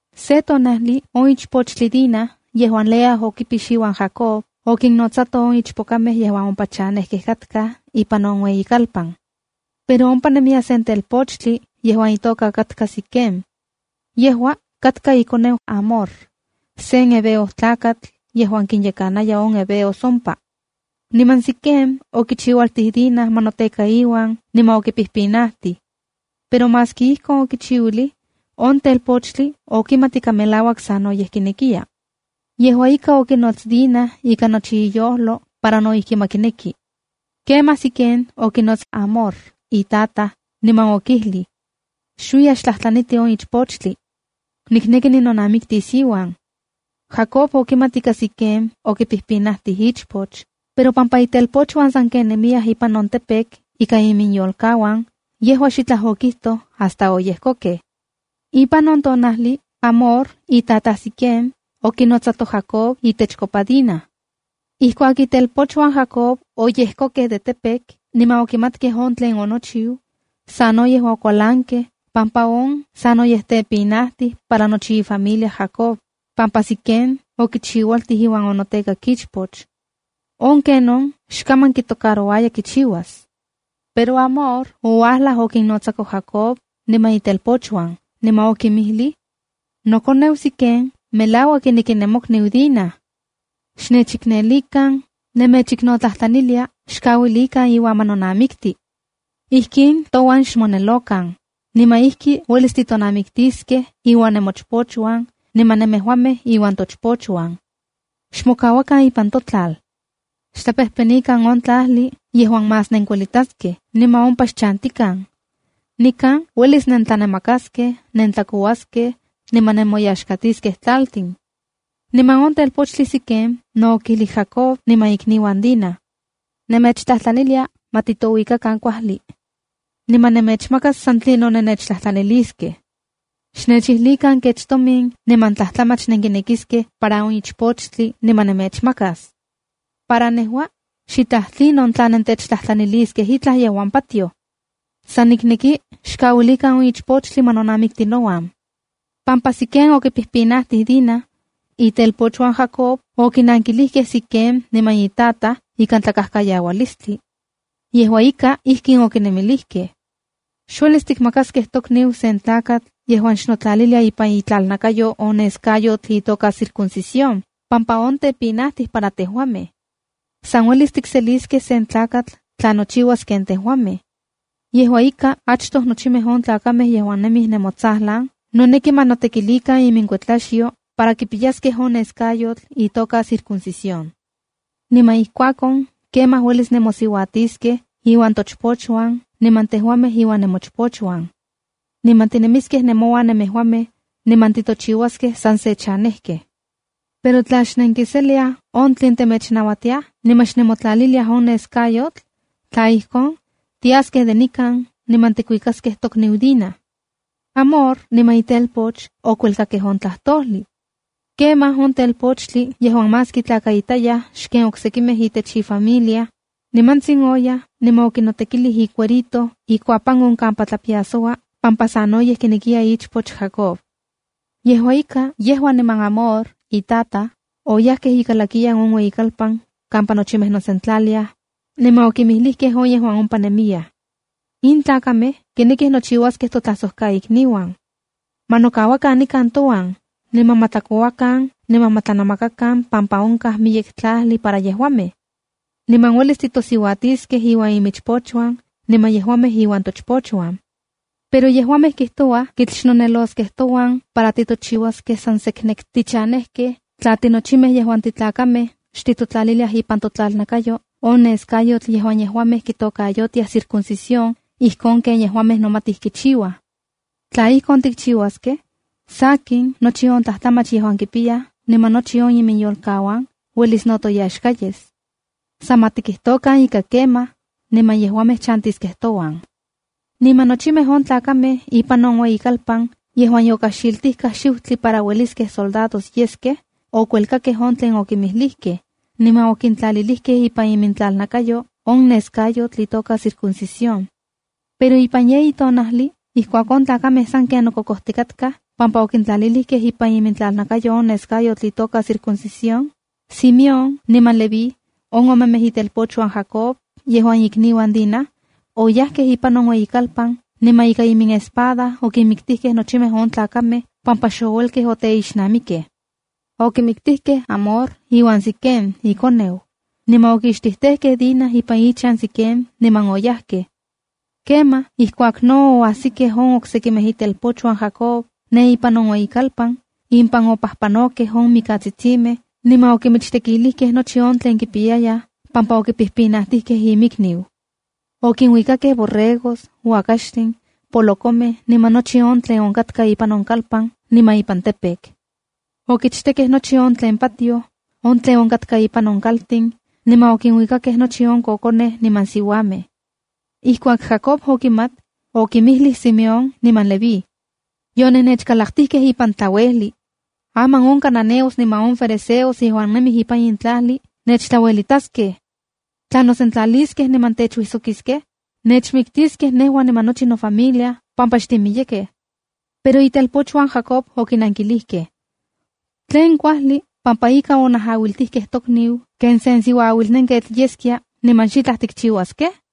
Se tonajli Dina, on ichpochtli yejuan Lea okipix iuan Jacob, okinnotsato on ichpokamej yejuan ompa chanejkej katkaj ipan on ueyikalpan. Pero ompa nemiya sen telpochtli yejuan itoka katka Siquem. Yejua katka ikoneu Hamor, sen heveo tlakatl yejuan kinyekanaya on heveos ompa. Niman Siquem okichiualtij Dina ma noteka iuan niman okipijpinajtij. Pero maski ijkon okichiuilij, on telpochtli okimat ika melauak sanoyej kinekiya. Yejua ika, okinots Dina ika nochi iyojlo para no ijki ma kineki. Kemaj Siquem okinots Hamor on itataj, niman okijlij: —Xuiya xtlajtlaniti on ichpochtli. Nikneki ninonamiktis iuan. Jacob okimat ika Siquem okipijpinajtij ichpoch, pero pampa itelpochuan sanken nemiyaj ipan on campo ika iminyolkauan, yejua xitlaj okijtoj hasta oyejkokej. Ipan on tonajli, Hamor itataj Siquem, okinotsato Jacob itechkopa Dina. Ijkuak itelpochuan Jacob oyejkokej de campo niman okimatkej on tlen onochiu, sanoyej okualankej pampa on sanoyej tepinajtij para nochi ifamilia Jacob, pampa Siquen okichiualtij iuan onotekak ichpoch. ¡On kenon xkaman kitocarouaya kichiuas! Pero Hamor oualaj okinnotsako Jacob niman itelpochuan, niman okinmijlij: —Nokoneu Siquem melauak kineki nemokniu Dina. Nemechiknotlajtlanilia, xkauilikan iuan ma nonamikti. Ijkin touan xmonelokan, niman ijki uelis titonamiktiskej iuan nemochpochuan, niman nemejuamej iuan tochpochuan. Xmokauakan ipan totlal. Xtlapejpenikan on tlajli yejuan más nenkuelitaskej niman ompa xchantikan. Nikan uelis nentlanamakaskej, nentlakouaskej niman nemoyaxkatiskej tlaltin. Niman on telpochtli Siquem no okijlij Jacob niman ikniuan Dina: —Nemechtlajtlanilia ma titouikakan kuajli. Nejua nemechmakas san tlinon nennechtlajtlaniskej. Xnechijlikan kech tomin niman tlajtlamach nenkinekiskej para on ichpochtli niman nemechmakas. Para nejua, xtlaj tlinon tla nentechtlajtlaniliskej itlaj yejuan patioj. San nikneki xkauilikan on ichpochtli ma nonamikti nouan. Pampa Siquem okipijpinajtij Dina, itelpochuan Jacob okinankijlijkej Siquem niman itataj ikan tlakajkayaualistli. Yejua ika, ijkin okinmijlijkej: —Xuelis tikmakaskej tokniu sen tlakatl yejuan xnotlalilia ipan itlalnakayo on nescayotl itoka circuncisión pampa on tepinajtij para tejuamej. San uelis tikseliskej sen tlakatl tla nochiuas ken tejuamej. Yejua ika, achtoj nochimej on tlakamej yejuan nemij nemotsajlan noneki ma notekilikan iminkuetlaxyo para kipiyaskej on neskayotl itoka circuncisión. Niman ijkuakon, kemaj, uelis nenmosiuatiskej iuan tochpochuan niman tejuamej iuan nemochpochuan. Niman tinemiskej nemouan nemejuamej, niman titochiuaskej san se chanejkej. Pero tla xnenkiseliaj on tlen temechnauatiaj niman xnemotlaliliaj on neskayotl, tla ijkon, tiaskej de nikan niman tikuikaskej tokniu Dina. Hamor niman itelpoch okuelkakej on tlajtojlij. Kemaj on telpochtli yejuan más kitlakaitayaj xken oksekimej itech ifamilia, nimantsin oyaj niman okinotekilij icuerito ikuatipan on kampa tlapiasoua pampa sanoyej kinekiya ichpoch Jacob. Yejua ika, yejua niman Hamor itataj, oyajkej ikalakiyan on ueyikalpan kampa nochimej nosentlaliaj, niman okinmijlijkej on yejuan ompa nemiyaj: —In tlakamej kinekij nochiuaskej toamigos. Ma nokauakan nikan touan, niman ma tlakouakan niman ma tlanamakakan pampa onkaj miyek tlajli para yejuamej. Niman uelis titosiuatiskej iuan imichpochuan, niman yejuamej iuan tochpochuan. Pero yejuamej kijtouaj kitl xnoneloskej touan para titochiuaskej san seknek tichanejkej tla tinochimej yejuan titlakamej xtitotlaliliaj ipan totlalnakayo on nescayotl yejuan yejuamej kitokayotiaj circuncisión, ijkon ken yejuamej nomatij kichiuaj. Tla ijkon tikchiuaskej, sakin nochi on tlajtlamach yejuan kipiyaj niman nochi iminyolkauan uelis no toyaxka yes. San ma tikijtokan ika kemaj, niman yejuamej chantiskej touan. Niman nochimej on tlakamej ipan on ueyikalpan yejuan yokajxitijkaj xiutli para ueliskej soldados yeskej, okuelkakej on tlen okinmijlijkej, niman okintlalilikej ipan imintlalnakayo on nescayotl itoka circuncisión. Pero ipan yeyi tonajli ijkuak on tlakamej sanken nokokojtikatkaj pampa okintlalilikej ipan imintlalnakayo on nescayotl itoka circuncisión, Simeón niman Leví, on omemej itelpochuan Jacob yejuan ikniuan Dina, oyajkej ipan on ueyikalpan niman ika iminespada okinmiktijkej nochimej on tlakamej pampa xouelkej oteixnamikej. Okimiktijkej Hamor iuan Siquem ikoneu, niman okixtijtejkej Dina ipan ichan Siquem niman oyajkej. Kemaj ijkuak no oajsikej on oksekimej itelpochuan Jacob ne ipan on ueyikalpan, impan opajpanokej on mikatsitsimej niman okinmichtekilijkej nochi on tlen kipiyayaj pampa okipijpinajtijkej inmikniu. Okinuikakej borregos, uakaxtin, polokomej niman nochi on tlen onkatka ipan on kalpan niman ipan campo. Okichtekkej nochi on tlen pajtioj, on tlen onkatka ipan kaltin, niman okinuikakej nochi on kokonej niman siuamej. Ijkuak Jacob okimat, okinmijlij Simeón niman Leví: —Yonennechkalaktijkej ipan tlauejli. Aman on cananeos niman on ferezeos yejuan nemij ipan in tlajli nechtlauelitaskej. Tla nosentlaliskej niman techuijsokiskej, nechmiktiskej nejua niman nochi nofamilia pampa xtimiyekej. Pero itelpochuan Jacob okinankilijkej: —¿Tlen kuajli pampa ika onajauiltijkej tokniu ken sen siuaauilnenketl yeskia niman xitlaj tikchiuaskej?